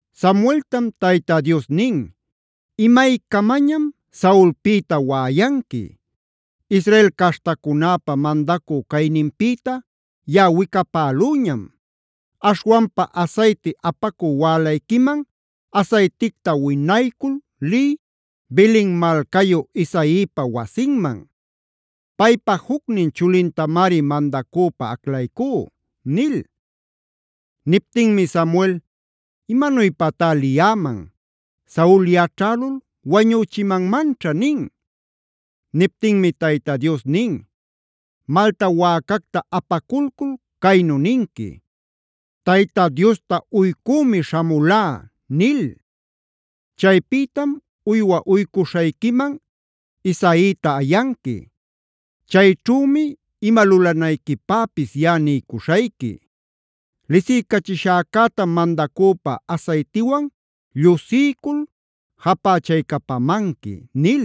Samueltam Tayta Dios nin: “¿Imaycamañam Saulpïta waꞌayanqui? Israel caśhtacunäpa mandacü cayninpïta yaꞌa wicapälüñam. Aśhwanpa asayti apacü wälayquiman asayticta winaycul liy, Belen malcayu Isaipa wasinman. Paypa jucnin chulintamari mandacüpä aclaycú” nil. Niptinmi Samuel: “¿Imanuypatá liyäman? Saul yaćhälul wañüchimanmanćha” nin. Niptinmi Tayta Dios nin: “Malta wäcacta apaculcul caynu ninqui: ‘Tayta Diosta uycümi śhamulá’ nil. Chaypïtam uywa uycuśhayquiman Isaita ayanqui. Chayćhümi ima lulanayquipäpis yaꞌa niycuśhayqui. Lisiycachishäcätam mandacüpä asaytiwan llusiycul japächaycapamanqui” nil.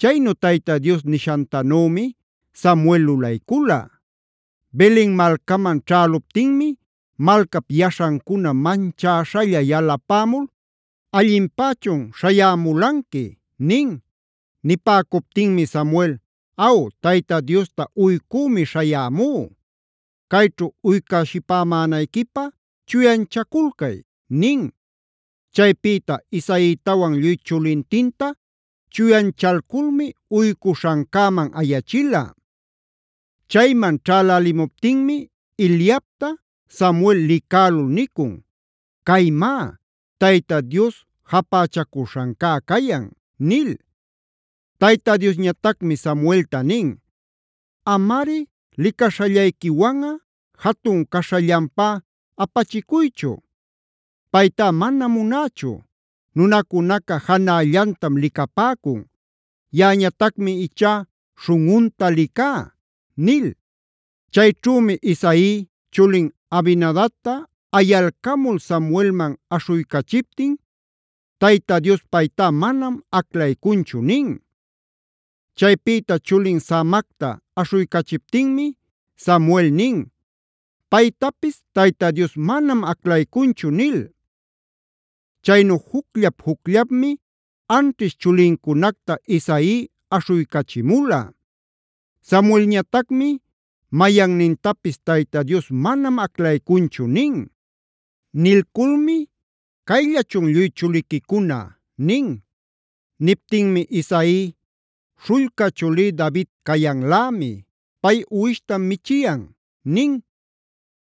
Chaynu Tayta Dios nishantanümi Samuel lulaycula. Belen malcaman ćhäluptinmi malcap yaśhancuna manchäśhalla yalapämul: “¿Allinpächun śhayämulanqui?” nin. Nipäcuptinmi Samuel: “Aw, Tayta Diosta uycümi śhayämú. Cayćhu uycäshipämänayquipä chuyanchaculcay” nin. Chaypïta Isaitawan lluy chulintinta chuyanchalculmi uycuśhancäman ayachila. Chayman ćhälälimuptinmi Eliabta Samuel licälul nicun: “Caymá, Tayta Dios japächacuśhancá cayan” nil. Tayta Diosñatacmi Samuelta nin: “Amari licaśhallayquiwanꞌa, jatun caśhallanpá apachicuychu. Paytá manam munächu. Nunacunaca janällantam licapäcun; yaꞌañatacmi ichá śhunꞌunta licá” nil. Chayćhümi Isai chulin Abinadabta ayalcamul Samuelman aśhuycachiptin: “Tayta Dios paytá manam aclaycunchu” nin. Chaypïta chulin Samacta aśhuycachiptinmi Samuel nin: “Paytapis Tayta Dios manam aclaycunchu” nil. Chaynu jucllap-jucllapmi anćhish chulincunacta Isai aśhuycachimula. Samuelñatacmi: “Mayannintapis Tayta Dios manam aclaycunchu” nin. Nilculmi: “¿Cayllachun lluy chuliquicuna?” nin. Niptinmi Isai: “Śhullca chulí David cayanlämi. Pay uwishtam michiyan” nin.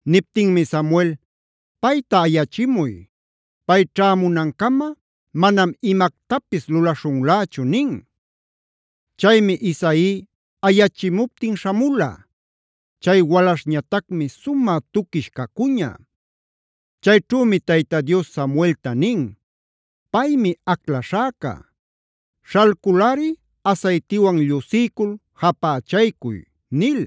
Niptinmi Samuel: “Payta ayachimuy. Pay ćhämunancama manam imactapis lulaśhunlächu” nin. Chaymi Isaí ayachimuptin śhamula. Chay walaśhñatacmi sumä tuquish cacuña. Chayćhümi Tayta Dios Samuelta nin: “Paymi aclaśhäca. Śhalculꞌari asaytiwan llusiycul japächaycuy” nil.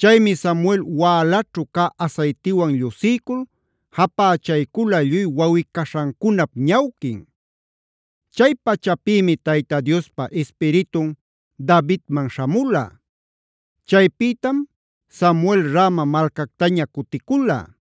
Chaymi Samuel wälaćhu cä asaytiwan llusiycul japächaycula lluy wawꞌi-caśhancunap ñawquin. Chay pachapïmi Tayta Diospa Ispiritun Davidman śhamula. Chaypïtam Samuel Rama malcactaña cuticula.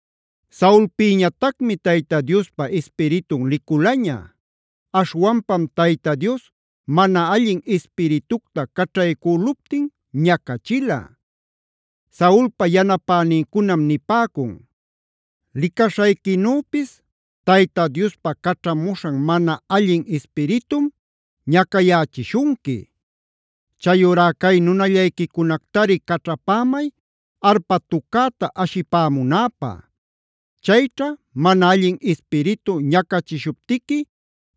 Saulpïñatacmi Tayta Diospa Ispiritun liculaña. Aśhwanpam Tayta Dios mana allin ispiritucta caćhaycüluptin ñacachila. Saulpa yanapänincunam nipäcun: “Licaśhayquinüpis, Tayta Diospa caćhamuśhan mana allin ispiritum ñacayächishunqui. Chayurá cay nunallayquicunactari caćhapämay arpa tucäta ashipämunäpä. Chayćha mana allin ispiritu ñacachishuptiqui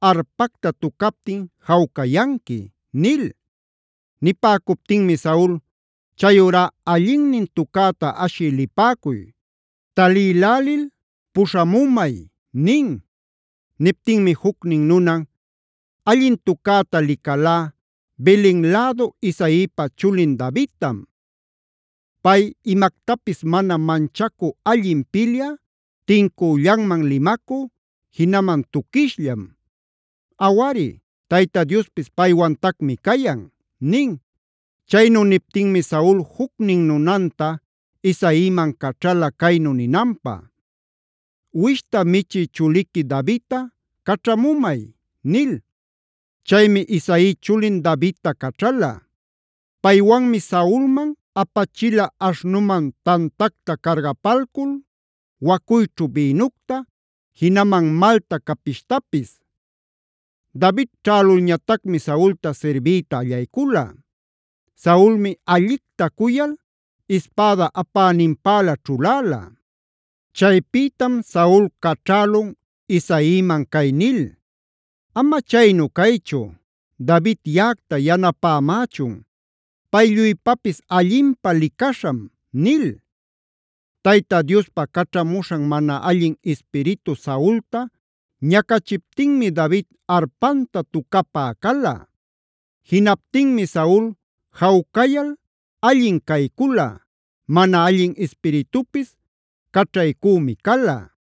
arpacta tucaptin jawcayanqui” nil. Nipäcuptinmi Saul: “Chayurá allinnin tucäta ashï lipäcuy. Talïlälil puśhamumay” nin. Niptinmi jucnin nunan: “Allin tucäta licalá Belen lädu Isaipa chulin Davidtam. Pay imactapis mana manchacü allin pilyä, tincüllanman limacü, jinaman tuquishllam. Awari Tayta Diospis paywantacmi cayan” nin. Chaynu niptinmi Saul jucnin nunanta Isaiman caćhala caynu ninanpä: “Uwishta michï chuliqui Davidta caćhamumay” nil. Chaymi Isai chulin Davidta caćhala. Paywanmi Saulman apachila aśhnuman tantacta cargapalcul, wacuyćhu bïnucta, jinaman malta capishtapis. David ćhälulñatacmi Saulta sirbiyta allaycula. Saulmi allicta cuyal ispäda apäninpälä ćhuläla. Chaypïtam Saul caćhälun Isaiman cay nil: “Ama chaynu caychu, David yaꞌacta yanapämächun. Pay lluypapis allinpä licaśham” nil. Tayta Diospa caćhamuśhan mana allin ispiritu Saulta ñacachiptinmi David arpanta tucapä cala. Jinaptinmi Saul jawcayal allin caycula, mana allin ispiritupis caćhaycümi cala.